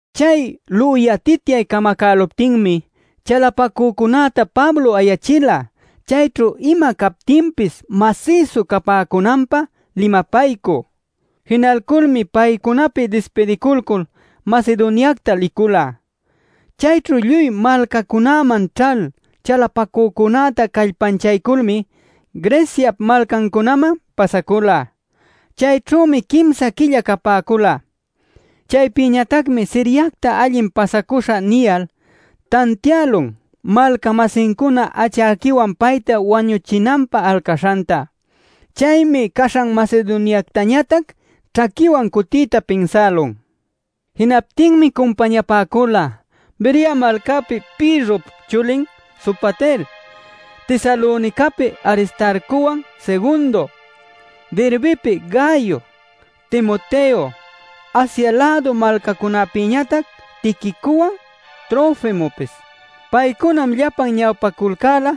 Chay lüyatityay camacäluptinmi chalapacücunäta Pablo ayachila chayćhu ima captinpis masïsu capäcunanpä limapaycü. Jinalculmi paycunapi dispidiculcul Macedoniacta licula. Chayćhu lluy malcacunäman ćhal chalapacücunäta callpanchayculmi Greciap malcancunaman pasacula. Chayćhümi quimsa quilla capäcula. Chaypïñatacmi Siriacta allin pasacuśhä niyal, tantiälun malca-masincuna achäquiwan payta wañuchinanpä alcaśhanta. Chaymi caśhan Macedoniactañatac ćhaquiwan cuticuyta pinsälun. Jinaptinmi cumpañapäcula Berea malcäpi Pirrop chulin Sopater, Tesalonicapi Aristarcowan Segundo, Derbepi Gayo, Timoteo, Asia-lädu malcacunäpïñatac Tiquicowan Trofimopis. Paycunam llapan ñawpaculcäla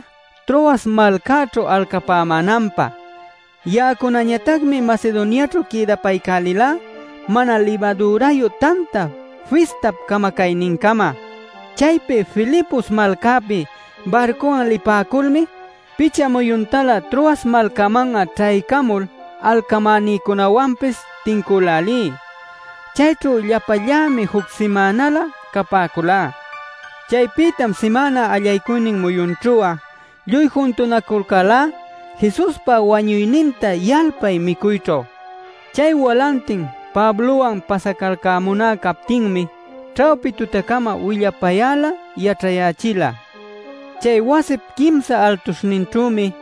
Troas malcäćhu alcapämänanpä. Ya'acunañatacmi Macedoniaćhu quïdapaycälilá Mana Libadürayu Tanta Fistap camacaynincama. Chaypi Filipos malcäpi barcuwan lipäculmi picha muyuntalä Troas malcäman'a ćhaycamul alcamänïcunäwanpis tincülälí. Chayćhu llapallämi juc simänalä capäculá. Chaypïtam simäna allaycuynin muyunćhu'a lluy juntunaculcälá Jesuspa wañuyninta yalpay micuyćhu. Chay walantin Pablowan pasacalcämuná captinmi ćhawpi tutacama willapayäla yaćhayächila. Chay wasip quimsa altuśhninćhümi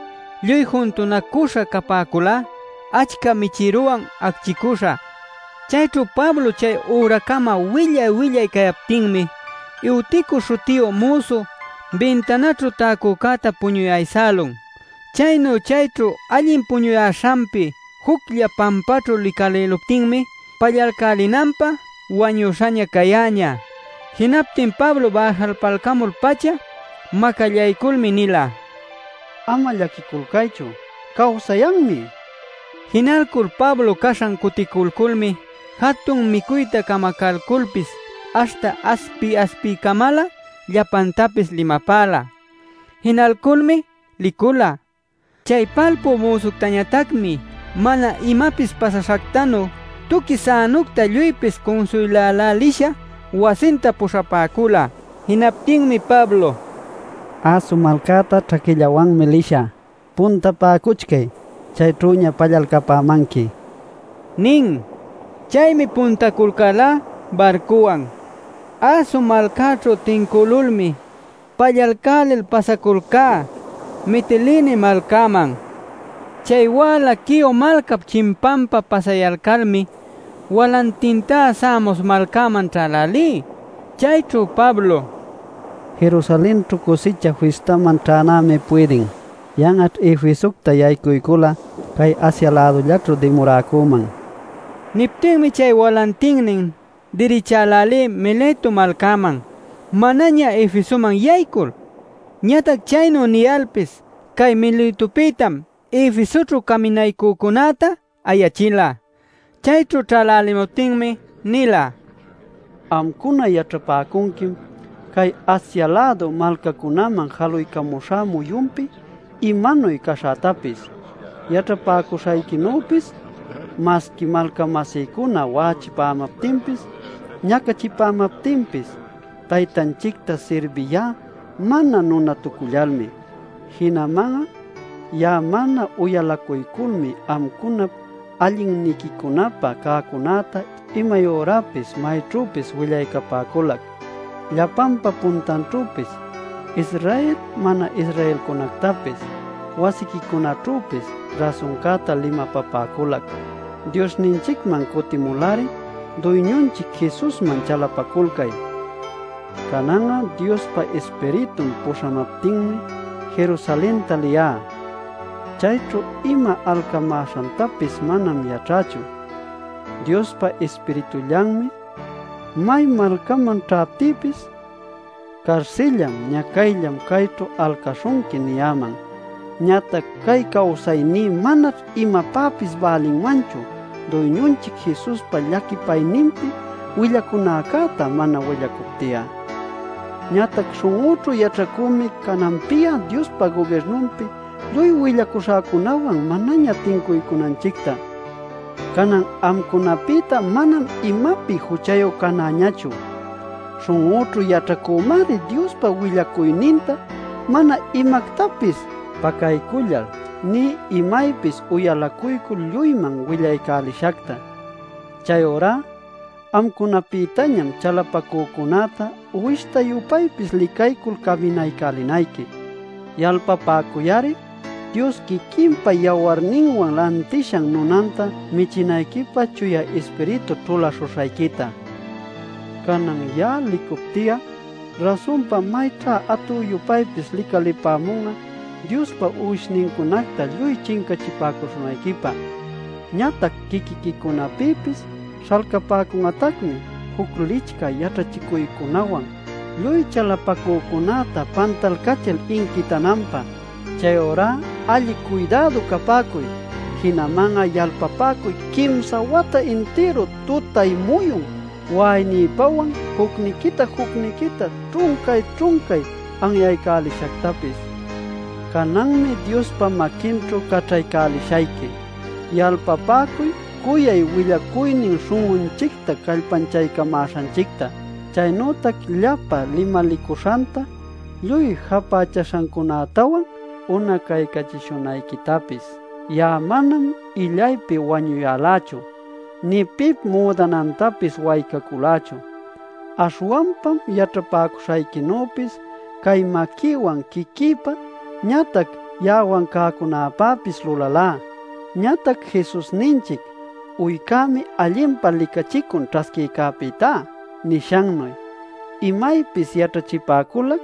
lluy juntunacüśha capäculá, achca michïrawan acchicüśha. Chayćhu Pablo chay üracama willay-willay cayaptinmi Eutico śhutiyu müsu bintanäćhu täcücäta puñuy aysälun. Chaynu chayćhu allin puñuyäśhanpi juclla pampäćhu licalïluptinmi pallalcälinanpä wañüśhaña cayäñä. Jinaptin Pablo bäjalpaycamul-pacha macallayculmi nila: “Ama llaquiculcaychu. ¡Cawsayanmi!” nil. Jinalcul Pablo caśhan cuticulculmi jatun micuyta camacalculpis, aśhta aspi-aspicamalä llapantapis limapäla. Jinalculmi licula. Chay palpü müsuctañatacmi mana imapis pasaśhactanu tuqui sänucta lluypis cunsuylälälisha wasinta puśhapäcula. Jinaptinmi Pablo: “Aso malcäta ćhaquillawanmi lishä. Puntapäcuchcay; chayćhüña pallalcapämanqui” nin. Chaymi puntaculcälá barcuwan. Aso malcäćhu tincülulmi, pallalcälil pasaculcá Mitilene malcäman. Chay wäla Quio malcap chimpanpä pasayalcalmi walantintá Samos malcäman ćhälälí. Chayćhu Pablo: “Jerusalenćhu Cusicha Fistäman ćhänämi puydin. Yan'aćh Efesocta yaycuycul'a cay Asia-lädullaćhu dimuräcüman” niptinmi chay walantinnin dirichälälí Mileto malcäman, manaña Efesoman yaycul. Ñatac chaynu niyalpis cay Miletopïtam Efesoćhu caminaycücunäta ayächila. Chayćhu ćhälälimuptinmi nila: “Amcuna yaćhapäcunquim cay Asia-lädu malcacunäman jaluycamuśhä muyunpi imanuy caśhätapis. Yaćhapäcuśhayquinüpis masqui malca-masïcuna wa'achipämaptinpis, ñacachipämaptinpis Taytanchicta sirbiyá mana nunatucullalmi. Jinaman'a ya'a mana uyalacuyculmi amcunap allinniquicunapä cäcunäta imay ürapis mayćhüpis willaycapäculac. Llapanpa puntanćhüpis, Israel mana-Israelcunactapis, wasiquicunaćhüpis rasuncäta limapapäculac: ‘Diosninchicman cutimul-ari, Duyñunchic Jesusman chalapaculcay’ nil. “Canan'a Diospa Ispiritun puśhamaptinmi Jerusalenta liyá. Chayćhu ima alcamäśhantapis manam yaćhächu. Diospa Ispiritullanmi may malcäman ćhaptïpis: ‘Carsillam, ñacayllam chayćhu alcäśhunqui’ niyäman. Ñatac cay cawsayní manaćh imapäpis bälinmanchu Duyñunchic Jesuspa llaquipayninpi willacunäcäta mana willacupti'a. “Ñatac śhun'üćhu yaćhacümi cananpi'a Diospa gubirnunpi lluy willacuśhäcunawan manaña tincunanchicta. Canan amcunapïta manam imapi juchayu canäñachu. Śhun'üćhu yaćhacümari Diospa willacuyninta mana imactapis pacaycullal nï imaypis uyalacuycul lluyman willaycälishacta. “Chayurá amcunapïtañam chalapacücunäta uwishta-yupaypis licaycul caminaycälinayqui. Yalpapäcuy-ari Dios quiquinpa yawarninwan lantishan nunanta michinayquipä Chuya Ispiritu ćhulaśhuśhayquita. Canan ya'a licupti'a rasunpa mayćhá atü-yupaypis licalipämun'a Diospa uwishnincunacta lluy chincachipäcuśhunayquipä. Ñatac quiquiquicunapïpis śhalcapäcun'atacmi juc licchä yaćhachicuycunawan lluy chalapacücunäta pantalcachil inquitananpä. ¡Chayurá alli cuydädu capäcuy! Jinaman'a yalpapäcuy quimsa wata intiru tutay-muyun wa'aynïpawan jucniquita-jucniquita ćhuncay-ćhuncay anyaycälishactapis. “Cananmi Diospa maquinćhu caćhaycälishayqui. Yalpapäcuy cuyay willacuynin śhun'unchicta callpanchamäśhanchicta, chaynütac llapa limalicuśhanta lluy japächäśhancunätawan unacaycachishunayquitapis. Ya'a manam illaypi wañuyälächu, nï pip müdanantapis waycaculächu. Aśhwanpam yaćhapäcuśhayquinüpis cay maquïwan quiquïpa ñatac ya'awan cäcunapäpis lulalá. Ñatac Jesusninchic: ‘Uycämi allinpa licachicun ćhasquïcäpïtá’ nishannuy, imaypis yaćhachipäculac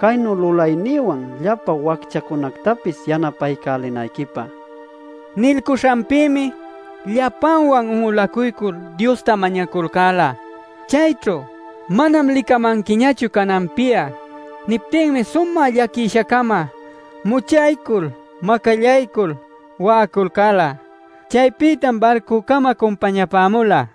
caynu lulaynïwan llapa wacchacunactapis yanapaycälinayquipä” nila. Nilcuśhanpïmi llapanwan un'ulacuycul Diosta mañaculcäla. Chayćhu “Manam licamanquiñachu cananpi'a” niptinmi sumä llaquisha-cama muchaycul macallaycul wa'aculcäla. Chaypïtam barcücama cumpañapämula.